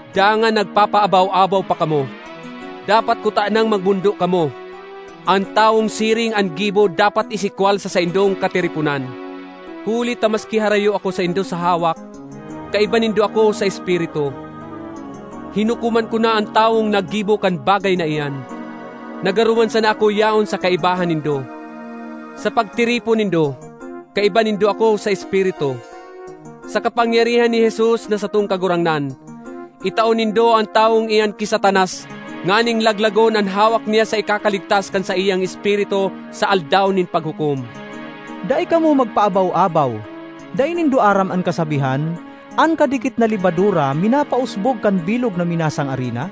Dangan nagpapaabaw-abaw pa kamo! Dapat kutanang magmondo kamo! An tawong siring an gibo dapat isikwal sa saindong katiriponan. Huli ta maski harayo ako saindo sa hawak, kaiba nindo ako sa espiritu; hinukoman ko na an tawong naggibo kan bagay na iyan, na garo man sana ako yaon sa kaibahan nindo. Sa pagtiripon nindo, kaiba nindo ako sa espiritu. Sa kapangyarihan ni Jesus na satong Kagurangnan, itao nindo an tawong iyan ki Satanas nganing laglagon an hawak niya sa ikakaligtas kan saiyang espiritu sa Aldaw nin Paghukom. Dai kamo magpaabaw-abaw! Dai nindo aram an kasabihan, “An kadikit na lebadura minapausbog kan bilog na minasang arina”?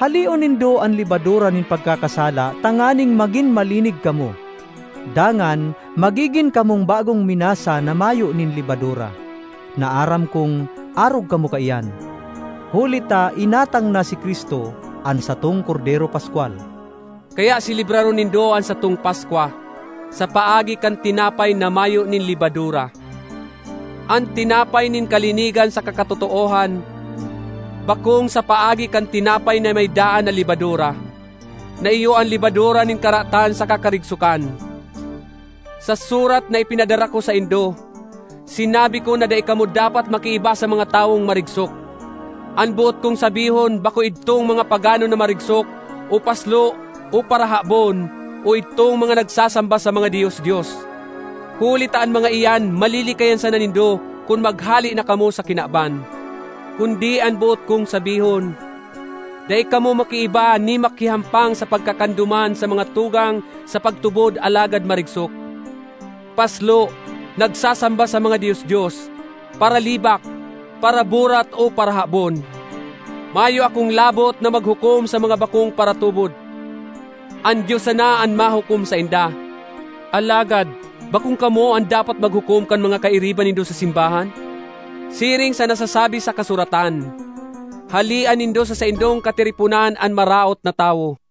Haleon nindo an lebadura nin pagkakasala tanganing magin malinig kamo. Dangan magigin kamong bagong minasa na mayo nin lebadura, na aram kong arog kamo kaiyan. Huli ta inatang na si Cristo, an satong kordero paskwal. Kaya selebraron nindo an satong Paskwa, sa paagi kan tinapay na mayo nin lebadura—an tinapay nin kalinigan saka katotoohan—bakong sa paagi kan tinapay na may daan na lebadura, na iyo an lebadura nin karatan saka karigsokan. Sa surat na ipinadara ko saindo, sinabi ko na dai kamo dapat makiiba sa mga tawong marigsok. An boot kong sabihon bako idtong mga pagano na marigsok o paslo o parahabon o idtong mga nagsasamba sa mga dios-dios; huli ta an mga iyan malilikayan sana nindo kun maghale na kamo sa kinaban. Kundi an boot kong sabihon, dai kamo makiiba ni makihampang sa pagkakan duman sa mga tugang sa pagtubod alagad marigsok, paslo, nagsasamba sa mga dios-dios, paralibak, paraburat o parahabon. Mayo akong labot na maghukom sa mga bakong paratubod. An Dios sana an mahukom sainda. Alagad bakong kamo an dapat maghukom kan mga kairiba nindo sa simbahan? Siring sa nasasabi sa kasuratan, “Halea nindo sa saindong katiriponan an maraot na tawo.”